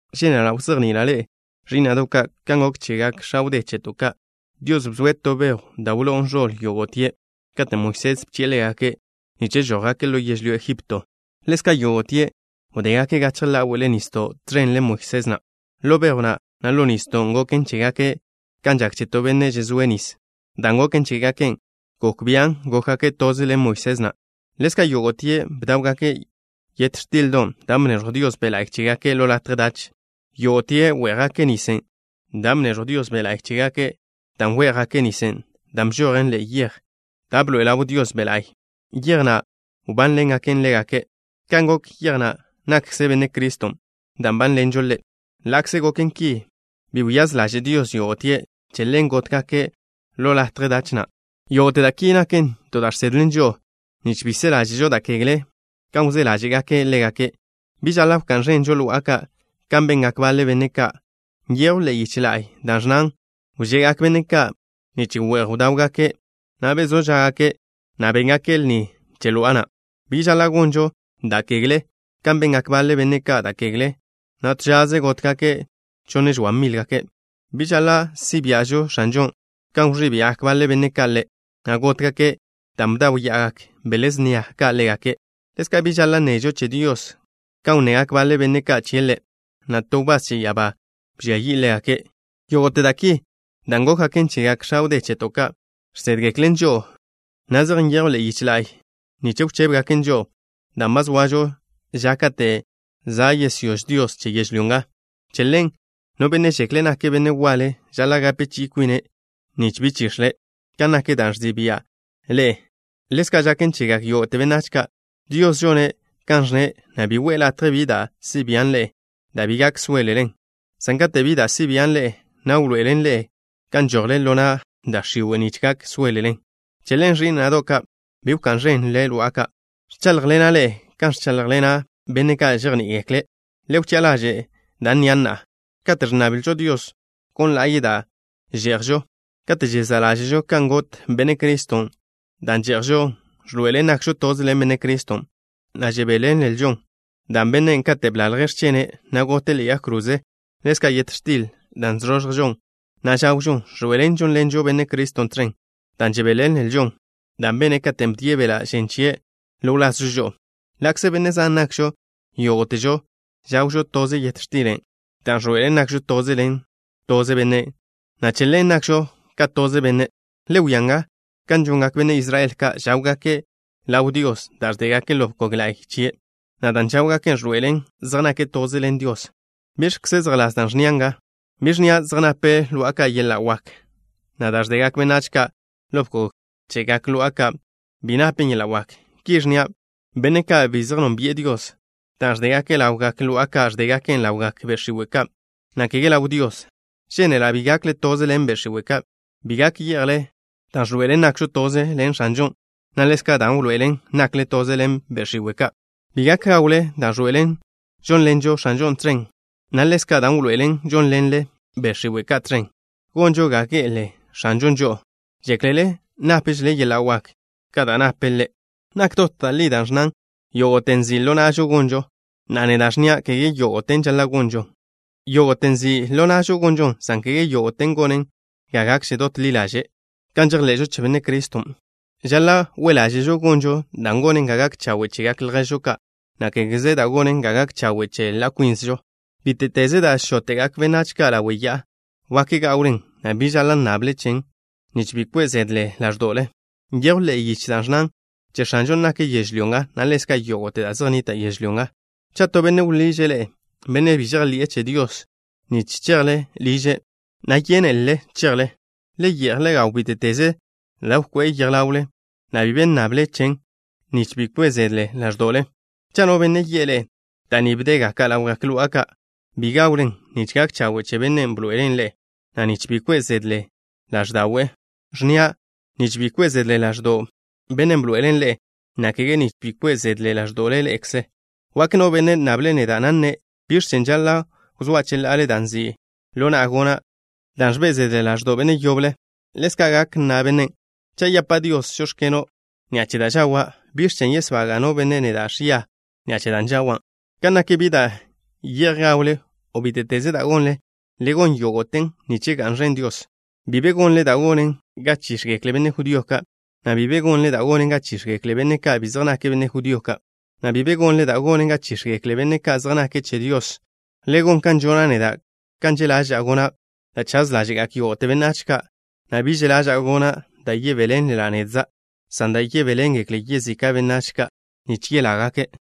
Žénela' wzejni'ila' ḻe'e, ẕí'na'do' ka', kan gok chegak x̱a wdé cheto' ka'. Dios bzoe' to bejw da' wló'on ẕoḻ yógo'tie' katen' Moisés bchi'e ḻégake' nich žójgake' ḻo yežlyó Ejipto. Ḻezka', yógo'tie' wdégake' gachje ḻáwe'le nisdo' tẕen ḻen Moisés na'. Ḻo bejw na', na' ḻo nisdon', gok chégake' kan žak che to benne' žezóe' nis. Dan' goken chégake' gok bian' gókgake' toze ḻen Moisés na'. Ḻezka' yógo'tie' bdáwgake' yet x̱tildon', dan' bneẕjw Dios Be' La'y chégake' ḻo latje dach. Yógo'tie' wé'jgake' nisen' dan' bneẕjw Dios Be' La'y chégake', dan' wé'jgake' nisen' dan' bžojen ḻe'e yej na' da' bḻoe'e ḻaw Dios Be' La'y, yej na' wbánḻengake' ḻégake'. Kan gok yej na' nakkze Benne' Criston', dan' nbánḻenžo Ḻe'. Ḻa'kze goken ki, bi wyáz ḻaže' Dios yógo'tie'. Che ḻen gótgake' ḻo latje dach na'. Yógo'te da' ki naken to da' žsedlen žo'o, nich bi se ḻáže'žo da' kegle, kan wzé ḻáže'gaken' ḻégake'. Bi žaḻa' wká'n ẕenžo lo'a ka', kan bengak baḻe benne' ka'. Nyejw ḻe'e yiche la'y da' ẕnnan: “Wže'gak benne' ka' nich we'j bdáwgake', na' bezó žá'gake', na' béngake' lni che lo'a na'.” Bi žaḻa' gonžo da' kegle, kan bengak baḻe benne' ka' da' kegle, na' to žaze gótgake' chonne-žoa mile'. Bi žaḻa' si' bia'žo X̱anžon', kan wẕí' bia'gak baḻe benne' ka' Ḻe', na' gótgake' dan' bdáwya'agak bele snia ka' ḻégake'. Ḻezka', bi žaḻa' nnežo che Dios kan wnnegak baḻe benne' ka' chie' Ḻe', na' to wbás che ya'abá bžia yi'e ḻégake'. Yógo'te da' ki da' gókgaken chegak x̱a wdé cheto' ka', žsédgeklen žo'o, na' zej nyejwn ḻe'e yiche la'y nich wchébegaken žo'o, dan' ba zoažo ža kate' za' yesyóž Dios che yežlyó nga. Che ḻen, no benne' žekle' nake' benne' waḻe, žaḻa' gape chi'i kwine', nich bi chix̱le'. Kan nak da' ẕzi' bia' ḻe'e, ḻezka' žaken chegak yógo'te benách ka'. Dios žone' kan ẕnne', na' bi we'e latje bi da' si' bian' ḻe'e da' bi gak sóelelen, san kate' bi da' si' bian' ḻe'e, na' wḻoe'ele' ḻe'e kan žojle ḻo na' da' x̱iwe', nich gak sóelelen. Che ḻen, ẕí'na'do' ka', bi wká'n ẕenle lo'a ka'. Ẕcháḻjḻena' ḻe'e kan ẕcháḻjḻena' benne' ka' žejní'igekle'. Le wchi'a ḻaže' da' nnia' na'a. Kate' ẕnnablžo Dios gon la'ye' da' že'jžo kate' žezá' ḻáže'žo kan got Benne' Criston', dan' že'jžon ẕḻoe'elen nakžo toze ḻen Benne' Criston', na' žebéḻenlžo da' bene' katen' blalje' x̱chene', na' gote' ḻe'e yag kroze. Ḻezka', yet x̱tilen' da' ẕzoẕjžon, na' žawžon, ẕḻoe'elen žónḻenžo Benne' Criston' tẕen, dan' žebéḻenlžo da' bene' katen' bdie' beḻa' žen chie' ḻo wlazžo žo'o. Ḻa'kze benne' zan nakžo, yógo'težo žawžo toze yet x̱tilen', da' ẕḻoe'elen nakžo toze ḻen toze Bennen', na' che ḻen nakžo ka toze benne'. Le wia nga kan žongak benne' Israel ka'. Žáwgake' ḻaw Dios da' ẕdégake' ḻo bkog la'y chie', na' dan' žáwgake' ẕḻoe'elen zej nake' toze ḻen Dios. ¿Biẕkze zejḻás da' ẕnnia' nga? Bi ẕnnia' zej nape lo'a ka' yeḻa' wak, na' da' ẕdegak benách ka' ḻo bkog chegak lo'a ka' bi napen yeḻa' wak. Ki ẕnnia': benne' ka' bi zej nónbi'e Dios, da' ẕdégake' ḻawgak lo'a ka', ẕdégaken' ḻawgak be' x̱iwe' ka', na' kege ḻaw Dios. Žénela' bi gakle toze ḻen be' x̱iwe' ka'. Bi gak ye'jle dan' ẕḻoe'elen nakžo toze ḻen X̱anžon', na' ḻezka' dan' wḻoe'elen nakle toze ḻen be' x̱iwe' ka'. Bi gak gawle dan' ẕḻoe'elen žónḻenžo X̱anžon' tẕen, na' ḻezka' dan' wḻoe'elen žónḻenle be' x̱iwe' ka' tẕen. ¿Gonžo ga ge'ele X̱anžon' žo'o? ¿Žéklele nápžele yeḻa' wak ka da' nape' Ḻe'? Nak dot da' li da' ẕnnan: “Yógo'te nzi' ḻo na'žo gonžon.” Na'a, neda' ẕnnia': kege yógo'ten žaḻa' gonžon. Yógo'te nzi' ḻo na'žo gonžon, san kege yógo'ten gonen ga gakže dot ḻi ḻaže' kan žejḻe'žo che Benne' Criston'. Žaḻa' we' ḻáže'žo gonžo da' gonen ga gak chawe' chegak lježžo ka', na' kégeze da' gonen ga gak chawe' che ḻa' kwínzežo. Bíte'teze da' žóte'gak benách ka' ḻawe' ya'a, wak gawlen, na' bi be žaḻa' nnable chen, nich bi kwe' zede ḻáẕdo'le. Nyejw ḻe'e yiche da' ẕnnan: “Che X̱anžon' nak yežlyó nga, na' ḻezka' yógo'te da' zej nnita' yežlyó nga.” Cha' to benne' wḻiže' ḻe'e, benne' bi žejḻi'e che Dios, nich yidle liže', na' yénelele chejle, le ye'j le gaw bíte'teze da' wkoé'e ḻawle, na' bi be nnable chen, nich bi kwe' zede ḻáẕdo'le. Cha' no benne' yi'e ḻe'e: “Da' ni bdégake' ḻawgak lo'a ka'” bi gawlen nich gak chawe' che bennen' bḻoe'elen' ḻe'e, na' nich bi kwe' zede ḻáẕda'we'. Ẕnnia': “Nich bi kwe' zede ḻáẕdo'w bennen' bḻoe'elen' ḻe'e” na' kege nich bi kwe' zede ḻáẕdo'le ḻe'ekze. Wak no benne' nnable' neda', na' nne': “¿Biẕ chen' žaḻa' wzóa' cheḻa'ale da' nzi' ḻo na'a gona' dan' ẕbe' zeden ḻáẕdo'w benne' yoble?” Ḻezka' gak nna bennen': “Cha' yapa' Dios: žóx̱keno', ni'a che da' žawa', ¿biẕ chen' yesbaga' no benne' neda' ẕia ni'a che da' žawan'?” Ka nak bi da' ye'j gawle, o bíte'teze da' gonle, le gon yógo'ten nich ga'n ẕen Dios. Bi be gonle da' gonen ga chíx̱gekle benne' judío ka', na' bi be gonle da' gonen ga chíx̱gekle benne' ka' bi zej nake' benne' judío ka', na' bi be gonle da' gonen ga chíx̱gekle benne' ka' zej nake' che Dios. Le gon kan žona' neda', kan že' ḻaža'a gona' da' chaz ḻáže'gak yógo'te benách ka', na' bi že' ḻaža'a gona' da' yebéḻenla' nedza', san da' yebéḻengekle yezika' benách ka' nich yelágake'.